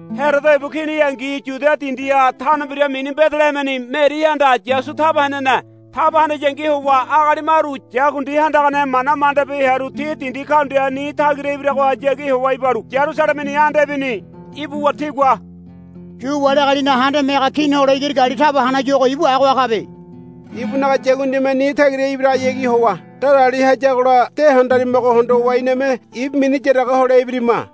Herodo ibu kini heangi Yuda dindiha tano mbira mini Bedelehemeni Merihanda Yasu taba henene. Taba hanayangi howa agali maru yakundi handagane mana mandabi hearu ti dindi kaundia ni tagira ibiragohayagi howa ibalu Yarusalemeni anda ibini. Ibuwa tigua, Yu wali agalinaga handame haga kini hole igiri gali taba hanayuago ibu agoha kabe. Ibunaga yakundime ni tagira ibiragohayagi howa darali hayagola de handarimago hondowa iname ibu mini yaraga hole ibirima,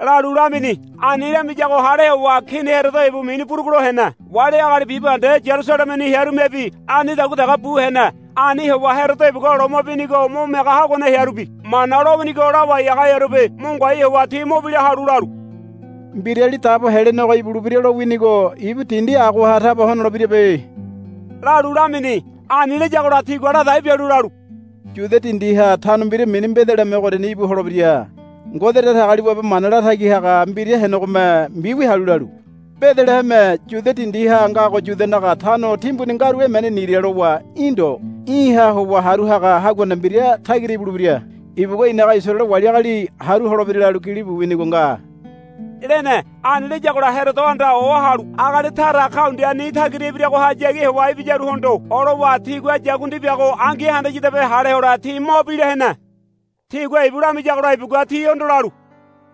lalu lamini. Ani lamiyago hale howa Kini Herodo ibu mini burugulo hene. Wali agali bibahende Yarusalemeni hearumebi anidagua dege bu hene. Ani howa Herodo ibugua loma binigo mo miaga haguane hearubi Mana lowinigo lawai haga hearubi mo ngoai howa ti mo bila halu lalu, Mbirali Dabo Helenego ibulebira lowinigo ibu dindi agoha taba honolebirabe, lalu lamini. Ani layagola tigua ladai bialu lalu, Yuda dindiha tano mbira mini Bedeleheme ogoriani íbu holebira. Ngode Datagaliwabe mana latagi haga mbira henegome mbiwia halu lalu, Bedeleheme Yuda dindiha ngago Yudanaga tano timbuni ngaru emene nira lowa í̠ ndo. Í̠ha howa haru haga haguane mbira tagira ibulebira. Ibugua i̱naga Isaraele wali agali haru holebira, lalu gilibu winigo nga, lene. Ani layagola Herodohanda ohalu agali tara kaundia ni tagira ibiragohayagi howa ibiyaruhondo olowa tigua yakundi biago angi handayadabe hale hole ti mo bila hene. Tigua ibu lamiyagola ibugua tihondo lalu,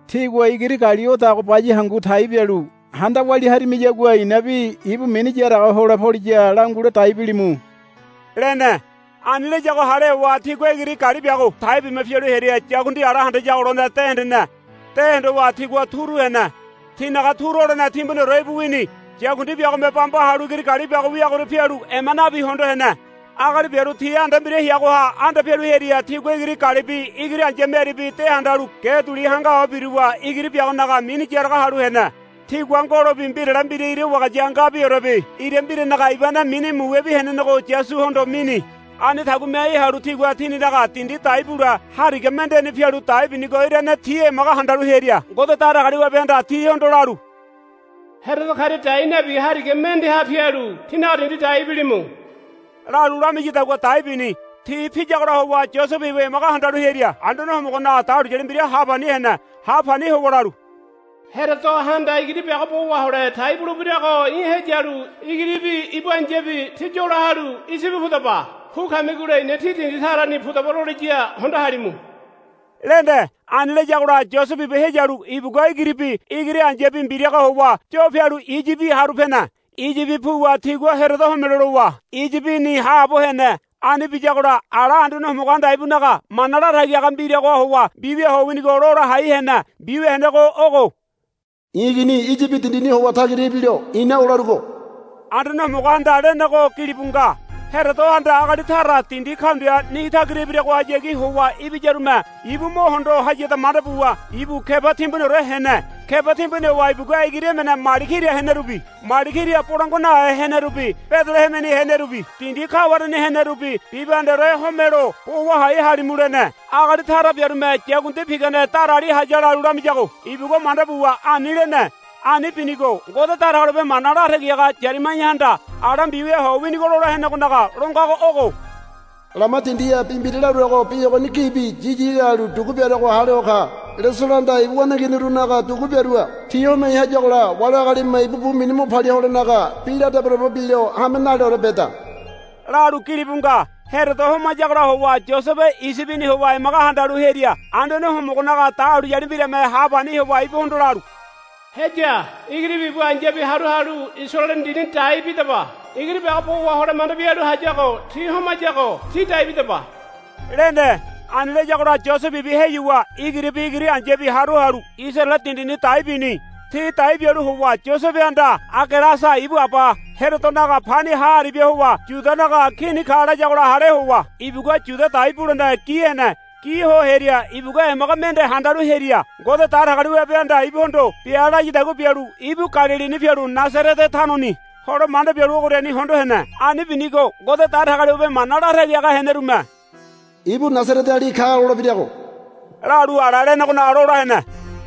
Tígua igiri gali odago baya hangu tai bialu handa walia harimiyagua i̱nabi ibu mini yaraga hole poliya langule dai bilimu, lene. Ani layago hale howa tigua igiri gali biago tai bima pialu hearia yakundi ala handayago lone de hendene. De hondowa tigua turu hene. Tinaga turu holene timbuniore íbu wini. Yakundi biagome bamba halu igiri gali biago wiagoria pialu ema nabi hondo hene. Agali biaru ti anda mbira heagoha anda pialu hearia tigua igiri galibi igiri ai̱ya Meribi de handalu ge duli hanga ho biruwa igiri biagonaga mini yaraga halu hene. Tigua ngolobi mbirale mbira ira wagaya ngabiorebi ira mbiranaga ibane mini muwebi henenego Yasuhondo mini. Ani tagu miai halu tigua tininaga dindi dai bule hariga mendeni pialu dai binigo irane ti emaga handalu hearia Ngode Datagaliwabehanda tihondo lalu, Herodo karia dai nabi hariga mendeha pialu tínaga dindi dai bilimu, lalu lamiyadagua dai bini. Ti piyagola howa Yosebe ibu emaga handalu hearia Anduane Homogonaga dahuliyali mbira ha pani hene. Ha pani howa lalu, Herodohanda igiri biago bo wahole tai bulebirago í̠ heyalu igiribi ibu ai̱yabi tí yola halu Iyibi pudaba. Pu kamigola i̱na tí dindi tarani pudaba loliya hondo halimu, lene. Ani layagola Yosebe ibu heyalu ibugua igiribi igiri ai̱yabi mbiraga howa yo pialu Iyibi haru pene. Iyibi puwa tigua Herodo homelo lowa Iyibini haabo hene. Ani biyagola ala Anduane Homogohanda ibunaga mana latagi haga mbiragoha howa mbiwia ho winigo lola hai hene. Mbiwia henego ogo, I̱ igini Iyibi dindini howa tagira ibilo i̱na olarugo, Anduane Homogohanda lenego gilibu nga. Herodohanda agali tara dindi kaundia ni tagira ibiragohayagi howa ibiyarume ibu mo hondo hayada manda buwa ibu keba timbuniore hene. Keba timbuni howa ibugua igiri emene mali kira henerubi mali kira bolangua nahe henerubi Bedelehemeni henerubi dindi kawareni henerubi bibahendeore homelo, Bo wahai halimu, lene. Agali tara biarume, Yakundi pigane darali haya, lalu lamiyago ibugua manda buwa ani lene. Ani binigo Ngode Datagaliwabe mana latagi haga Yaremaiahanda ala mbiwia ho winigo lola henegonaga lo ngago ogo, Lama dindiha bi mbira laruago bi ogoni gibi yiyi lalu dugu biaruago hale ho ka. Leselohanda ibu waneiginirunaga dugu biarua. Ti homai hayagola wali agalime ibu bu mini mo palia holenaga bi la debodebo bilo hame naleore beda, lalu gilibu nga. Herodo homayagola howa Yosebe Iyibini howa emaga handalu hearia Anduane Homogonaga dahuliyali mbirame ha pani howa ibuhondo lalu, Heya. Igiribi ibu ai̱yabi haru halu Isaraele dindini dai bidaba. Igiri biago bo wahole manda bialu hayago ti homayago tí dai bidaba, lene. Ani layagola Yosebe ibu heyuwa igiribi ibu ai̱yabi haru halu Isaraele dindini dai bini. Ti dai bialu howa Yosebehanda Agelasa ibu aba Herodonaga pani ha aribia howa Yudanaga kini ka layagola hale howa ibugua Yuda dai bulene gi hene. Gi ho hearia ibugua emaga mende handalu hearia Ngode Datagaliwabehanda ibuhondo bia layadagua bialu ibu Galilini pialu Nasarete tanoni hole manda bialu ogoriani hondo hene. Ani binigo Ngode Datagaliwabe mana latagi haga henerume, Ibu Nasareteali ka lolebirago, lalu ala lenegonaga lola hene.